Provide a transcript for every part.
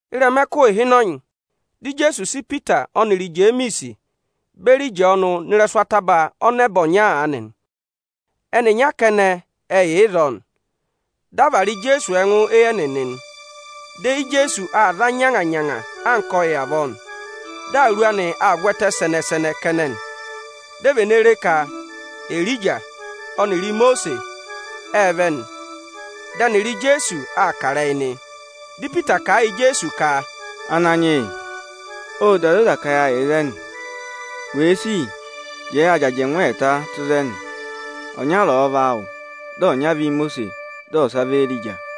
Ịrẹma ẹkụhị ịhịnọnyị, dị Ijeesu sị Ipita ọnịrị Ijemiisi beri Ịjọọnụ nọ ịrẹsụ ataba ọnẹba ọnya aanị nị. Ẹnịnya kẹnẹ ẹ yà ịzọọ nị. Dị a vara Ijeesu ẹngụ éyi ẹnịnị nị. Dị eyi Ijeesu aa za nyanga-nyanga anka ọyị avọọ nị. Dị awuru anị aa vwẹtẹ sẹnẹ-sẹnẹ kẹnẹ nị. Di e vene re ka Erija ọnịrị Imosiisi ệ vẹ nị. Dị ẹnịrị Ijeesu aa kà ịrẹyị nị. Dị Ipita kà a yị Ijeesu ka, “Ananyị yị ộ da zoza ka yâ yà ịzẹnị. Wèe sì, jẹẹ ya jị ajẹngụ ẹẹta tụ́ ịzẹnị; ọnyara ọ̀ọ vị áawụ, dị ọnya vị Ímosiisi, dị ọsa vị Éerija.”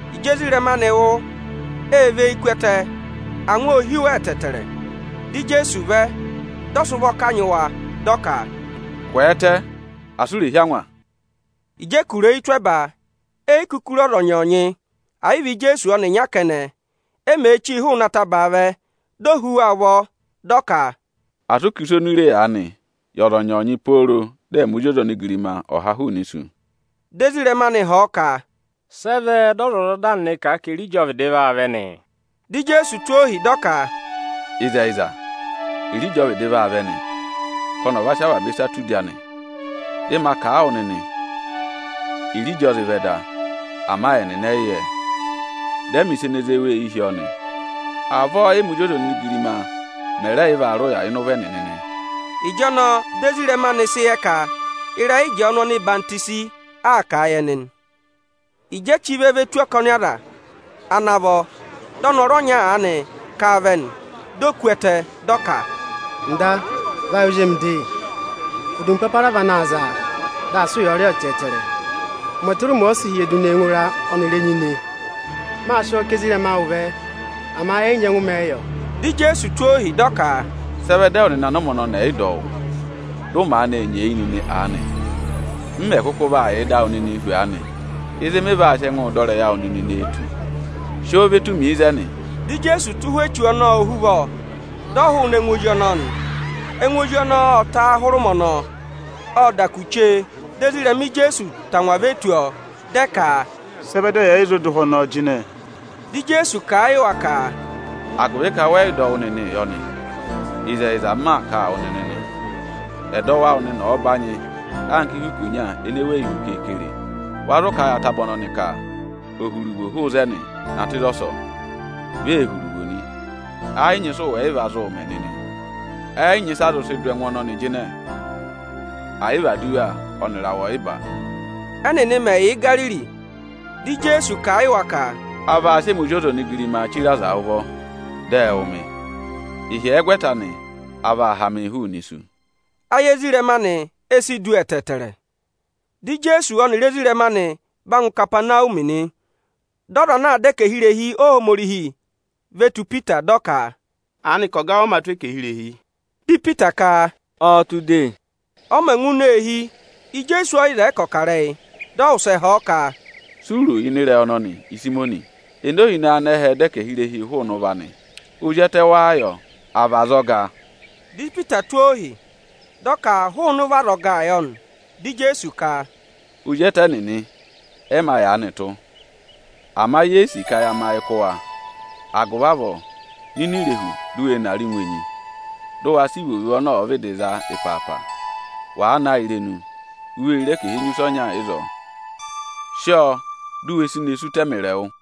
Ịjị ezirẹma anị wụ́, ệ và eyi ku ẹtẹ, angwa ô hí wa ẹtẹẹtẹrẹ. Dị Ijeesu vẹ, dị ọ sị ụvọ kanyị wa, dị ọ ka, “Kwẹẹtẹ asị u rè hí angwa nịnị!” Ịjị ẹ kụ̀rà eyi tụ́ ẹba, e yi kuku re ọza ọnyọọnyị, ẹ̀ yị vị Ijeesu ọnịnya kẹnẹ. E mèe chíi hụụnị atabaa vẹ, di o hú wa ụvọ, dị ọ ka, “Asị ụ kà ịsa oni u re aanị yị ọza ọnyọọnyị pooro dị ẹmị Ozi ọza onigirima ọ̀ ha hụụnị isu!” Dị ezirẹma anị họ̀ ọ ka, “Sị ẹ vẹ dị ọzwọzọda nịnị kà a ka Erija ọ vịdị vaa vẹ nị?” Dị Ijeesu tụ́ ohi, dị ọ ka, “Ịzẹyịza, Erija ọ vịdị vaa vẹ nị, ka ọnị ọ̀ va sị avaba ịsa tụ́ udi anị. Dị ma kà a wụ nịnị Erija ọ zị vẹ da, ama ẹnịnị ẹ yị yẹ ẹ; dị ẹ mẹ̀ ịsa ene zé wa eyi hi ọọ nị. Avọọ ẹ́mị Ozi ọza onigirima mẹ̀ rẹ yị vaa rị ụya ịnị ụvọ ẹnịnị nị.” Ịjọnọọ dị ezirẹma anị sị yẹ ka ịrẹyị Ịjọọnụ ọhwọzenyi aa kà a yị ẹnị nị. Ịjị e chí vẹ ve tù ọkọnị aza ana vọ, dị ọnọrụ ọnya aanị kà vẹ nị. Di o ku ẹtẹ, dị ọ ka, “Ọga vayị ozi emi de! Odumpapara vị ana za a, dị aa sị ụyaa rị ọọ ẹtẹẹtẹrẹ. Ụmẹ tụra ụmẹ ọ sịị̄ hyẹdụ nee ngụ ịra ọnịrị ini enyi nị. Mâ sị ọọ ká ezirẹma awụ vẹ, ama ẹ yị nyẹngụ mẹ̀ ẹ yọ.” Dị Ijeesu tụ́ ohi, dị ọ ka, “Sị ẹ vẹ dị ẹwụ nịnị anụmẹ ọnọnị ẹ̀ yị dọ wụ́, dị ụ maanị nyeeyi nịnị aanị? Ịzị mị vaa yàa pe wu nịnị nee tù? Ịzị mị vaa sị ẹngụụ dọ ịrẹyị awụ nịnị nee tù? Sị ọọ ve tù mi ịzẹnị!” Dị Ijeesu tụ́ ụhwẹ echu ọnọọ ohuvọ, dị ọ hụụnị ẹngụ ozi ọnọọ nị. Ẹngụ ozi ọnọọ ộ ta hụrẹ ụmẹ ọnọọ. Ộ da kù chee, dị ezirẹma Ijeesu tangwa ve tù ọọ, dị ẹ ka, “Sị ẹ vẹ dị ẹyị ẹ̀ yị zụ dụ ụhwẹ ọnọọ jịnẹ?” Ịkọ 13.2Dị Ijeesu kà a yị wa ka, “Agụvị ka wẹ yị dọ wụ́ nịnịị yọ nị. Ịzẹyịza, m maa kà a wụ nịnị nị, ẹdọwụ awụ nịnị ọ̀ọ banyị anka ihu ikonya ene weyi hu keekere, wa zụ kà a yị ataba ọnọnị ka ò hu iruvo hụụ ịzẹnị na tụ́ ịzọsọọ, vi ee hu iruvo nị, ẹ yị nyị ịsị ụ wẹ̀ yị va zụụ mẹ nịnị. [ Ẹ yị nyị ịsị a zụ sị dụ ẹngụ ọnọnị jịnẹ, ẹ̀ yị vị aduwa ọnịrị awẹ ọyịba.”] Ẹ́nịnị mẹ̀ yà Igariri, dị Ijeesu kà a yị wa ka, “A vaa sị ẹmị Ozi ọza onigirimaa chire aza ụvọ, dị ẹ wụ̀ mị; ịhyẹgwẹta anị, a vaa ha mịị hụụnị isu.” Ayị ezirẹma anị e si du ẹtẹẹtẹrẹ. Dị Ijeesu ọnịrị ezirẹma anị va ngụ Ikapanawumi nị. Dị ọza anaā dọ ẹkẹhị irehi ahẹkẹ Aniju ve tù Ipita, dị ọ ka, “Aanịka ọga awụ ọ mā tụ́ ẹkẹhị irehi?” Dị Ipita ka, “Ọọ̄ tụ́ de.” Ọ mẹ̀ ngụ ini eehi, Ijeesu ẹ yị zẹẹ ka ọ̀ kà ịrẹyị; dị ọ wụsẹ họ̀ ọ ka, “Si u ro ịnị ịrẹyị ọnọnị, Ịsayịmọnị? Ene ohinọyị anẹhẹẹ̄ dọ ẹkẹhị irehi hụụnị ụvọ anị? Ozi ẹtẹ wáá yọ, à vị azọga?” Dị Ipita tụ́ ohi, dị ọ ka hụụnị ụvọ azọgaa yọ nị. Dị Ijeesu ka, “Ozi ẹtẹ nịnị ẹ mā yaanị tụ́. Ama ye yi sì ka ya mẹ ayị kụ́ wa. Agụvị avọọ, nọ ini irehu, di u we ne arị ngụ enyi, dị ụ wa sị ivovo ọnị ọ̀ọ vịdị za ịpaapa! Wàa ha a irenu, u vee re ẹkẹhị enyusẹ ọnya ịzọọ; sị ọọ dụ we si ne sí ụta ẹmịrị ẹwụ!”